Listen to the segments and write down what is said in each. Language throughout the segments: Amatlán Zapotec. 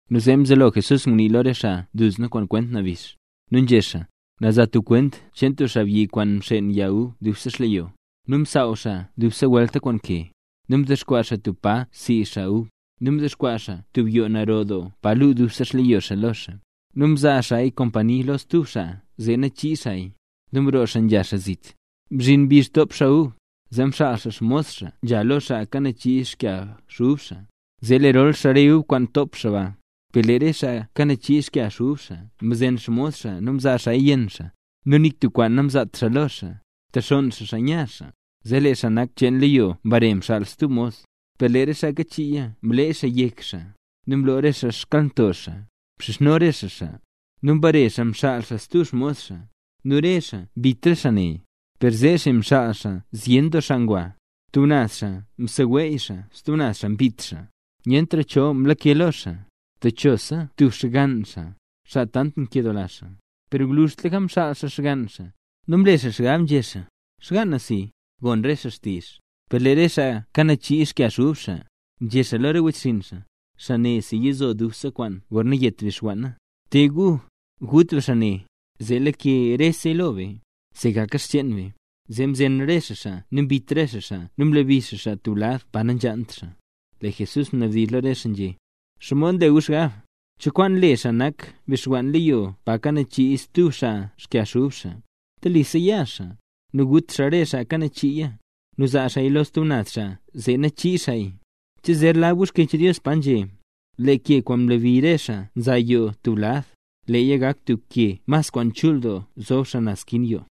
Nu zee mzelo Jesús ngunii lo re xaa duzna kwent nabix. Nu nzhé xaa: —Na za tub kwent cheen tub xaabyi kwaan mxeen yag ub dubse xleyo. Nu msaaw xaa dub welta kwaan ke. Nu mdexkwaa xaa tub pa sii xaa ub, nu mdexkwaa xaa tub yoo naro doo pa luu dubse xleyo xaa lo xaa. Nu mzaa xaaya kompani lo stub xaa zee nachii xaaya, nu mroo xaa nzha xaa zit. Mzhin mbizh top xaa ub, zee mxaal xaa xmos xaa nzha lo xaa kanachii xkag ub xaa, zee lerol xaa re ub kwaan top xaa ba. Per lee re xaa kanachii xkag ub xaa mzen xmos xaa nu mzaaya yenn xaa, nu nik tub kwaan namzaat xaa lo xaa, mtexonn xaa xaa nya xaa. Zee lee xaa nak cheen leyo mbare mxaal stub xmos. Per lee re xaa kanachiiya mlee xaa yek xaa, nu mlo re xaa xkalnto xaa, mxizhno re xaa xaa. Nu mbare xaa mxaal xaa stub xmos xaa. Nu re xaa mbit re xaa ne. Per zeesi mxaal xaa zyen doo xaa ngwa, tub naz xaa mseweey xaa nu stub naz xaa mbit xaa. ’Nyentra cho mlake lo xaa, techosa tub xgann xaa, xaa tant nkedoola xaa. Per gwluzhtlaka mxaal xaa xgann xaa. Nu mle xaa xgab, nzhé xaa: “Xgaan na si, gon re xaa xtizh”. Per lee re xaa kanachii xkag ub xaa, nzhé xaa lo re wechxinn xaa: “Xaa ne yizo dubse kwaane gorna yet bixwanna. Te gu, gut be xaa ne, zee lake reseya lo be, zee gaka xcheen be.” Zee mzen re xaa xaa nu mbit re xaa xaa nu mlebi re xaa xaa tub lad pa nanzhaant xaa. Lee Jesús mnabdizh lo re xaa nzhé: —¿Xomod nle gu xgab? ¿Cho kwaan le xaa nak bixwann leyo pa kanachii stub xaa xkyag ub xaa? Telisa ya xaa, nu gut xaa re xaa kanachiiya, nu zaa xaaya lo stub naz xaa zee nachii xaaya. ’¿Che zer lab gu Xkyech Dios? Leeya nzhé: Lee ke kwaan mlebi re xaa nza yoo tub lad, leeya gak tub ke mas kwaan chul doo zob xaa naz skin yoo.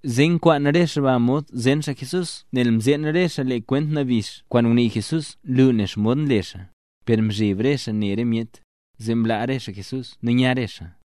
Zee nkwaan re xaa ba mod zen xaa Jesús nel mzeen re xaa lee kwent nabix kwaan ngunii Jesús nlu nen xomod nle xaa. Per nzheb re xaa ne re myet, zee mlaa re xaa Jesús nu nya re xaa.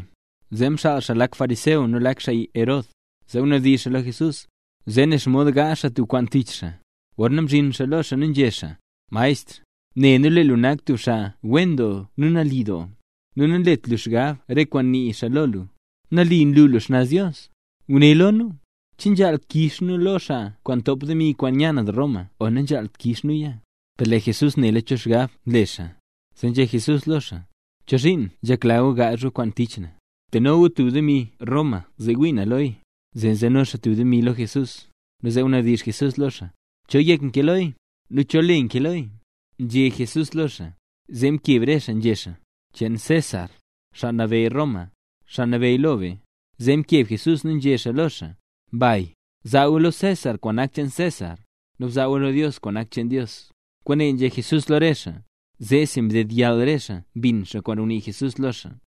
Nu zee mxaal xaa lak xaa fariseo nu lak xaa Herod, zee nzhanabdizh lo Jesús, zee ne xomod gaazh xaa tub kwaan tich xaa. Gorna mzhin xaa lo xaa nu nzhé xaa: —Maestr, ne nu lee lu nak tub xaa wen doo nu nali doo, nu nanlet lu xgab re kwaan nii xaa lo lu. Nali nlu lu xnaz Dios. Guné lo nu: ¿che nzhaal kix nu lo xaa kwaan ntop demi kwaan nya naz Roma o nanzhaalt kix nuya? Per lee Jesús nela cho xgab nle xaa, zee nzhé Jesús lo xaa: —¿Chozhiin nzhekla gu gaazh gu kwaan tich na? Teno gu tub demi Roma zee wii na loya. Zee nzeno xaa tub demi lo Jesús, nu zee mnabdizh Jesús lo xaa: —¿Cho yek nkee loya? ¿Nu cho le nkee loya? —nzhé Jesús lo xaa. Zee mkeb re xaa nzhé xaa: —Cheen César, xaa nabeyy Roma, xaa nabeyy lo be. Zee mkeb Jesús nu nzhé xaa lo xaa: —Mbay. Zaa gu lo César kwaan nak cheen César, nu bzaa gu lo Dios kwaan nak cheen Dios. Kwaane nzhé Jesús lo re xaa. Zeesi ndedyall re xaa mbin xaa kwaan ngunii Jesús lo xaa.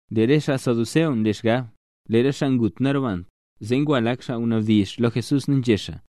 Lee re xaa saduceo nle xgab: “Lee re xaa ngut nanrobant”. Zee ngwa lak xaa ngunabdizh lo Jesús nu nzhé xaa: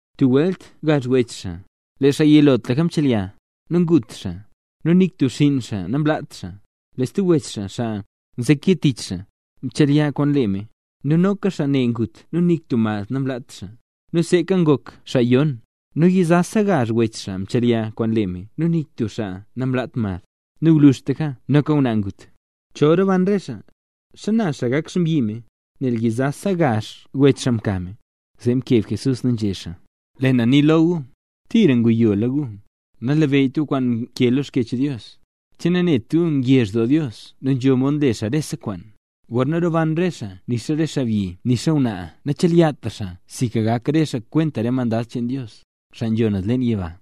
Tub welt gazh wech xaa. Lee xaa yilotlaka mchelya, ta ngut xaa. Nu nik tub xinn xaa namlaat xaa. Lee stub wech xaa, xaa nzeke tich xaa, mchelya kwaan lee me, nu noka xaa ne ngut nu nik tub mad namlaat xaa. Nu seeka ngok xaa yon. Nu yizasa gazh wech xaa mchelya kwaan lee me nu nik tub xaa namlaat mad. Nu gwluzhtlaka noka ngwnaa ngut. Chol roban re xaa, ¿xana xaa gak xmbyi me, nel yizasa gazh wech xaa mka me? Zee mkeb Jesús nu nzhé xaa: —Lee na nii lo gu, ¡tira nguyo gu! Nanlabeyyt gu kwaan nkee lo Xkyech Dios. ¿Che nanet gu ngezh doo Dios nu nzho mod le xaa rese kwaan? Gorna roban rese xaa nixa re xaabyi nu nixa ngwnaa nachelyatra xaa sinka gak re xaa kwenta re mandad cheen Dios, xaa nzho naz leen yiba.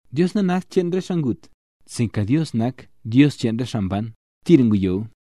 ¡Dios nanakt Dios cheen re xaa ngut, sinka Dios nak Dios cheen re xaa mban! ¡Tira nguyo gu!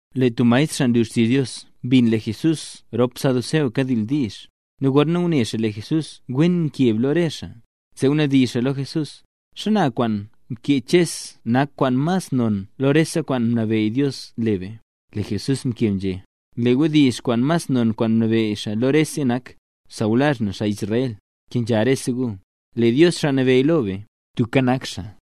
Lee tub maestr xaa nlu xtizh Dios mbin lee Jesús rop xaa saduceo kadildiizh. Nu gorna ngune xaa lee Jesús wen mkeb lo re xaa, zee ngunabdizh xaa lo Jesús: —¿Xana kwaan mkee Ches nak mas kwaan non lo rese kwaan mnabeyy Dios le be? Lee Jesús mkeb nzhé: —Lee wdizh mas non kwaan mnabeyy xaa lo rese nak: “Sawlazh na, xaa Israel, kenzha rese gu, lee Dios Xaa Nabeyy lo be, tubka nak xaa.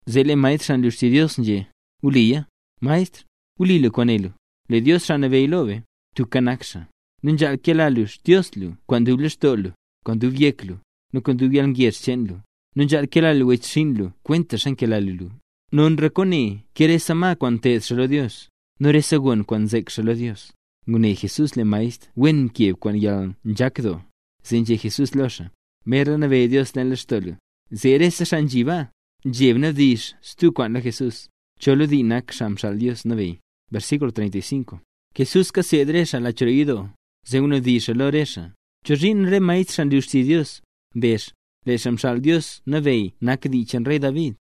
Zee lee maestr xaa nlu xtizh Dios, nzhé: —¡Wli luya, maestr! ¡Wli lu kwaan né lu! Lee Dios Xaa Nabeyy lo be, tubka nak xaa. Nu nzhaal kela lu Xdios lu kwaan dub lextoo lu, nu kwaan dub yek lu, nu kwaan dub yalngezh cheen lu, nu nzhaal kela lu wechxinn lu kwentaxa nkela lu lu. Nonra kwaane ke rese ma kwaan nteed xaa lo Dios, nu rese gon kwaan nzek xaa lo Dios. Ngune Jesús lee maestr wen mkeb kwaan yalnzhak doo, zee nzhé Jesús lo xaa: —Merla nabeyy Dios leen lextoo lu. Zee rese xaa nzhi baa, nzheb nabdizh stub kwaan lo Jesús. ¿Cho lo dii nak Xaa Xaal Dios Nabeyy? Jesús kaseed re xaa lach roo yidoo, zee ngunabdizh xaa lo re xaa: —¿Chozhiin re maestr, xaa nlu xtizh Dios, mbezh: “Lee Xaa Xaal Dios Nabeyy nak dii cheen David”?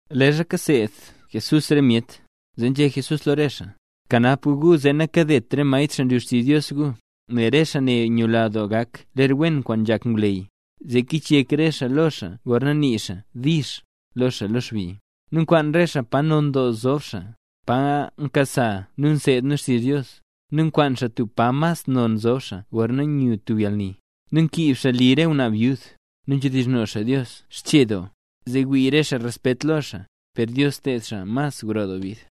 Leezha kaseed Jesús re myet, zee nzhé Jesús lo re xaa: —Kanap gu gu zee nakadet re maestr xaa nlu xtizh Dios gu, nel re xaa ne nyula doo gak ler wen kwaan nzhak ngwleyy, zee kichyek re xaa lo xaa gorna nii xaa “dix” lo xaa lo xbi. Nu nkwaan re xaa pa non doo zob xaa, pa nkasa be nseed be xtizh Dios, nu nkwaan xaa tub pa mas non nzob xaa gorna nyu tub yalni. Nu nkiib xaa li re ngwnaa byud. Nu nzhedizhno xaa Dios xchee doo, zee wii re xaa respet lo xaa. ¡Per Dios ted xaa mas gro doo bid!